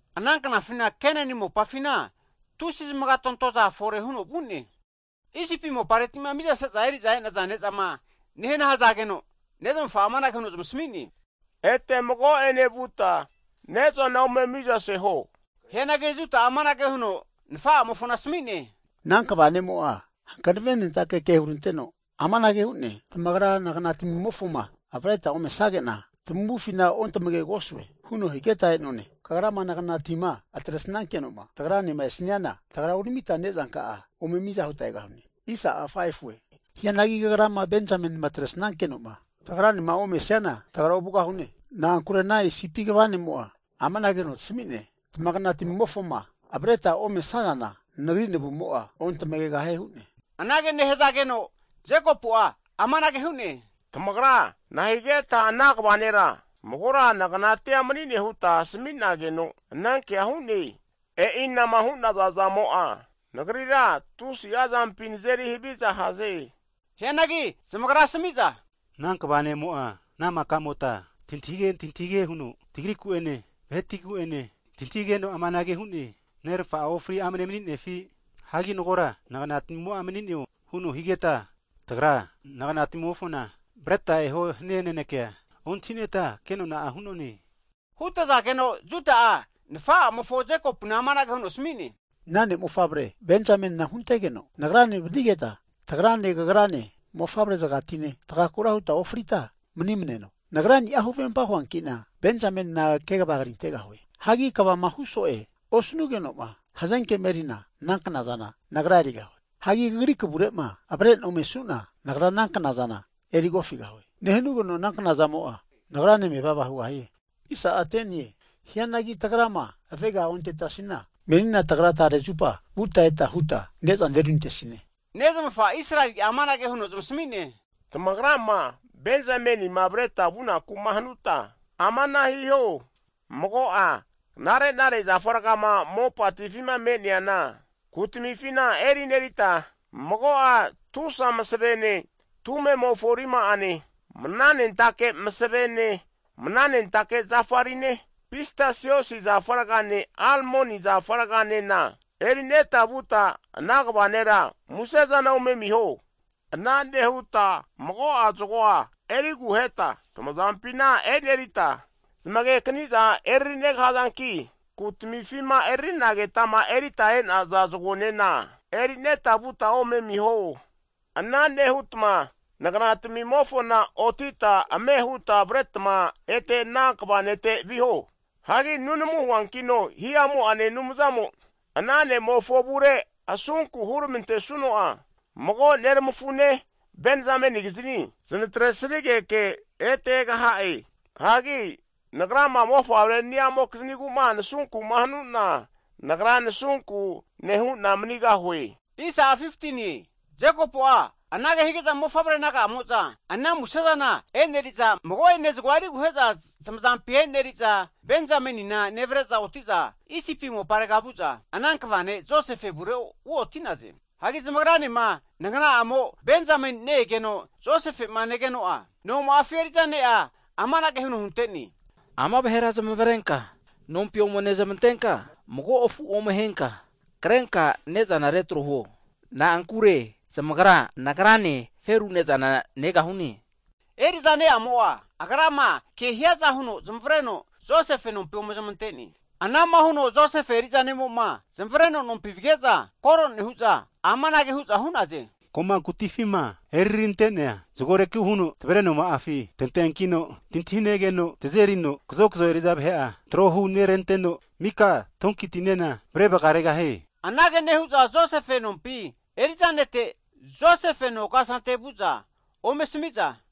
Ana knafina Kenani mopafina tusi zamagatontoza fore huno vu'ne. Isipi mopareti'ma mizase'za eri'za e'naza ne'zama nehana hazageno, nezmafa'a amanage huno zamasmi'ne, Ete mago'ene vuta ne'zana ome mizaseho. Hianagi Juda'a amanage huno nafa'amofona asami'ne, Ana kva ne'mo'a hankavenentake ke huranteno amanage hu'ne. Tamagra nagna tamimofoma avreta ome sanage'na tamavufina ontamagegosue huno higeta e'none. Kagrama naganatima atresankeno'ma tagra'enema esaniana, tagra uramita nezanka'a ome miza huta egahune. Hianagi kagrama Benzamenima atresnankeno'ma tagra'nema omesniana tagra ovugahune. Na'ankure ana Isipi kva ne'mo'a amanage huno tasami'ne, Tamagna timimofoma avretama omesazana nagri navumo'a ontamagegahie hu'ne. Anage nehazageno Jekopu'a (Israeli) amanage hu'ne, Tamagra nahigeta ana kva nera magora naganatia mani'ne huta asmi'nageno anankea hu'ne? E'ina'ma hu'naza zamo'a nagrira tusi'a zampi nazeri haviza haze. Hianagi zamagra asami'za, Ana kva ne'mo'a ana maka'mota tantahige tantahige huno tagriku'ene, vahetigu'ene, tantahigeno amanage hu'ne, Nermafa'a ofri amne mani'nefi? Hagi magora naganatamimo'a mani'neo? Huno higeta tamagra naganatamimofona avreta eho hani'a nanekea ontahineta kenona'a hu'none. Hutazageno Juda'a nafa'amofo Jekopuna amanage huno asmi'ne, Ana ne'mofavre Benzamenina huntegeno nagrane vanigeta, tagrane kagrane mofavre'zagatine tagakura huta ofrita mani'mneno. Nagrani'a huvempa huanki'na Benzamenina kegava krintegahue, hanki kvama hu'so'e osanugeno'ma hazenkema eri'na ana knazana nagra erigahue. Hagi kagri kavure'ma avre'na omesuna nagra ana knazana erigahue. Nehanugeno ana knazamo'a nagrane mevava hugahie. Hianagi tagrama avega ontetasina, menina tagra tare zupa vuta ete huta ne'zana eruntesine. Nezmafa Israeli'a amanage huno zamasami'ne, Tamagrama Benzamenima avreta vunaku'ma hanuta amana hiho, mago'a knare'nare zafa rgama mopatifima me'neana kutamifina erinerita mago'a tusa masevene (balm), tumemofo rima'ane, (honey) mananentake masavene, mananentake zafa rine, pistasios zafa ragane, almoni zafa raganena eri'neta vuta ana kva nera musezana ome amiho. Ana nehuta mago'a zagoa eri aguheta tamazampina e'rineta, zamage kaniza e'ririnegahazanki, kutamifima erarinagetama erita e'naza zagonena erineta vuta ome amiho. Ana nehutma nagna tami'mofona otita ame huta avretma ete ana kva nete viho. Hagi nunamu huankino hihamu'ane Anumzamo ana ne'mofo avure asunku huramantesuno'a, mago neramafune, Benzamenikiznia zanatre sanigeke ete egaha'e. Hagi nagrama mofavre ni'amokizmigu'ma nasunku'ma hanuna, nagra nasunku nehu'na manigahue. Jekopu'a anage hige'za mofavre naga'amo'za ana muse'zana (gift) e'neri'za, mago'ane zagoa eriguhe'za zamazampi e'neri'za, Benzamenina nevre'za oti'za Isipi moparega vu'za ana kva ne' Josefe avure uoti'naze. Hagi zamagranema nagana'amo Benzameni ne-egeno Josefe'ma negeno'a noma'afi eri'za ne'a amanage huno hunte'ne, Ama vahera zamavarenka nompi ome nezmantenka, mago afu ome ahenka krenka ne'zana retro huo. Na'ankure zamagra nagrane feru ne'zana negahune. Eri'za ne'amo'a agrama ke hiaza huno zamavareno Josefe nompi ome zamante'ne. Anama huno Josefe eri'za ne'mo'ma zamavareno nompi vige'za kore nehu'za amanage hu'za hu'naze. Ko'ma kutifima eriri rante'nea zagoreku huno tavre noma'afi tanteankino, tantahinegeno tazerino kazokzo eri'za vahe'a trohu neranteno mika donkitinena avre vagaregahie. Anage nehu'za Josefe nompi eri'za nete, Josefe no kasante vu'za ome asami'za,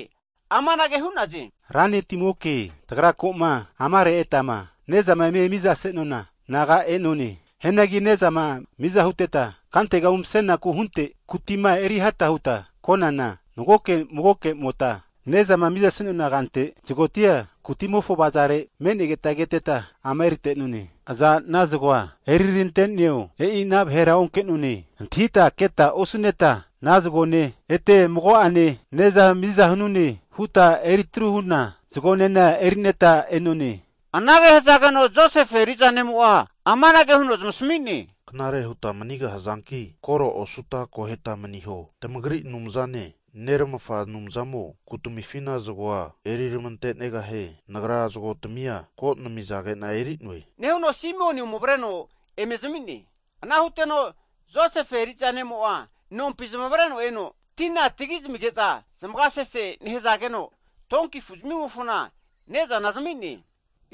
amanage hu'naze, ra netimoke, tagra ko'ma amare e'tama nezama eme miza senona naga e'none. Hianagi ne'zama miza huteta, kantega umsenaku hunte kutima eriheta huta konana, magoke magokemota ne'zama mizase'nona kante zagotia kutimofo avazare me'negeta keteta ama erita e'none. Aza ana zago'a eririranteneo e'i ana vahera onke'none. Antahita keta osu'neta ana zagone ete mago'ane ne'za miza hanune huta eritru huna zagonena erineta e'none. Anage hazageno Josefe eri'za ne'mo'a amanage huno zamasmi'ne, Knare huta manigahazanki koro osuta akoheta maniho. Tamagri Anumzane, neramafa Anumzamo kutamifina zagoa eriramante'negahie. Nagra zagotmia ko namizage'na eri'noe. Nehuno Simeoni ome avreno eme zami'ne. Ana huteno Josefe eri'za ne'mo'a nompi zamavareno eno, tina tagi zamige'za zamaga sese nehazageno, donki zamimofona ne'zana zami'ne.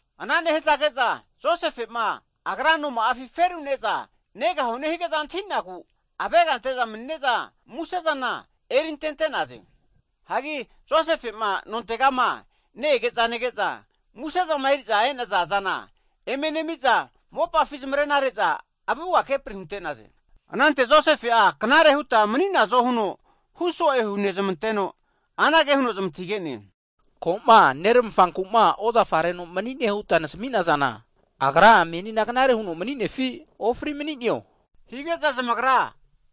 Ana nehazage'za Josefe'ma agra noma'afi ferura ne'za negahune hige'za antahi'nagu avega ante'za mani'ne'za musezana (gift) eri antente'naze. Hagi Josefe'ma nontegama ne-ege'za nege'za, musezama eri'za e'naza zana eme nemi'za mopafi zamarena re'za avuga kepri hunte'naze. Anante Josefe'a knare huta mani'nazo huno hu so'e hunezmanteno, anage huno zmantahige'ne, Ko'ma neramafanku'ma ozafa reno mani'ne huta nasmi'nazana, agra menina knare huno mani'nefi? Ofri mani'neo? Hige'za zamagra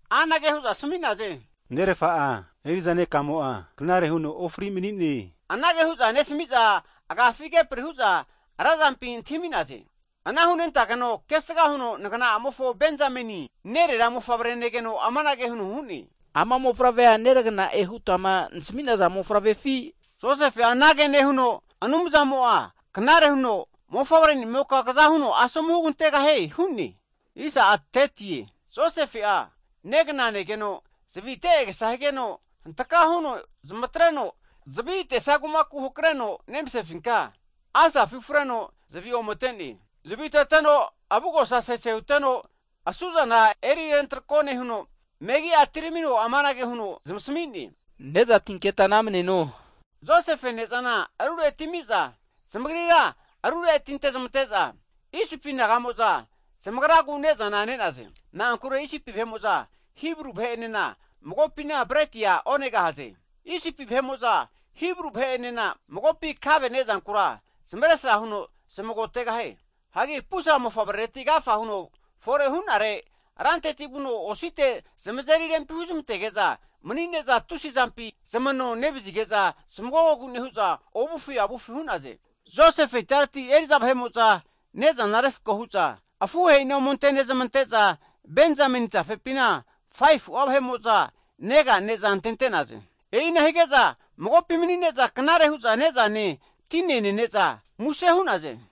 anage hu'za asmi'naze, Nerafa'a eri'za nekamo'a knare huno ofri mani'ne. Anage hu'za nesami'za agafi kepri hu'za razampi antahimi'naze. Ana hunentageno kesga huno nagna'amofo Benzameni, nerera mofavre negeno amanage huno hu'ne, Ama mofavrea neragana e'ma hutama nasmi'naza mofavrefi? Josefe anage nehuno, Anumzamo'a knare huno mofavrenimoka kaza huno asomu hugantegahie hu'ne. Josefe'a negna negeno zavi atesia agesa higeno, hantka huno zamatreno zavi ate'sia kumaku hakreno nemasefinka asafi (rum) ufreno zavi ome ate'ne. Zaviteteno avugosa sese huteno asu'zana eri rentrako nehuno, megi'a atiramino amanage huno zamasmi'ne, ne'za atinketa namaneno. Josefe ne'zana arure atimi'za, zamagrira arure atinte zamante'za, Isipi naga'mo'za zamagragu ne'zana ne'naze. Na'ankure Isipi vahe'mo'za Hibru vahe'enena magopina bretia onegahaze. Isipi vahe'mo'za Hibru vahe'enema magopi kave ne'zankura zamesra huno zamagotegahie. Hagi pusa mofavrereti agafa huno fore hu'nare, ranteti vuno osite zamazeri rempi huzmantage'za mani'ne'za tusi'a zampi zamano nevazige'za zamagogogu nehu'za ovufi avufi hu'naze. Josefe itareti eri'za vahe'mo'za ne'zana refko hu'za afuhe'i ome ante nezmante'za, Benzameni tafepina 5fu'a vahe'mo'za nega ne'za antente'naze. E'ina hige'za magopi mani'ne'za knare hu'za ne'zane, tine nene'za muse hu'naze.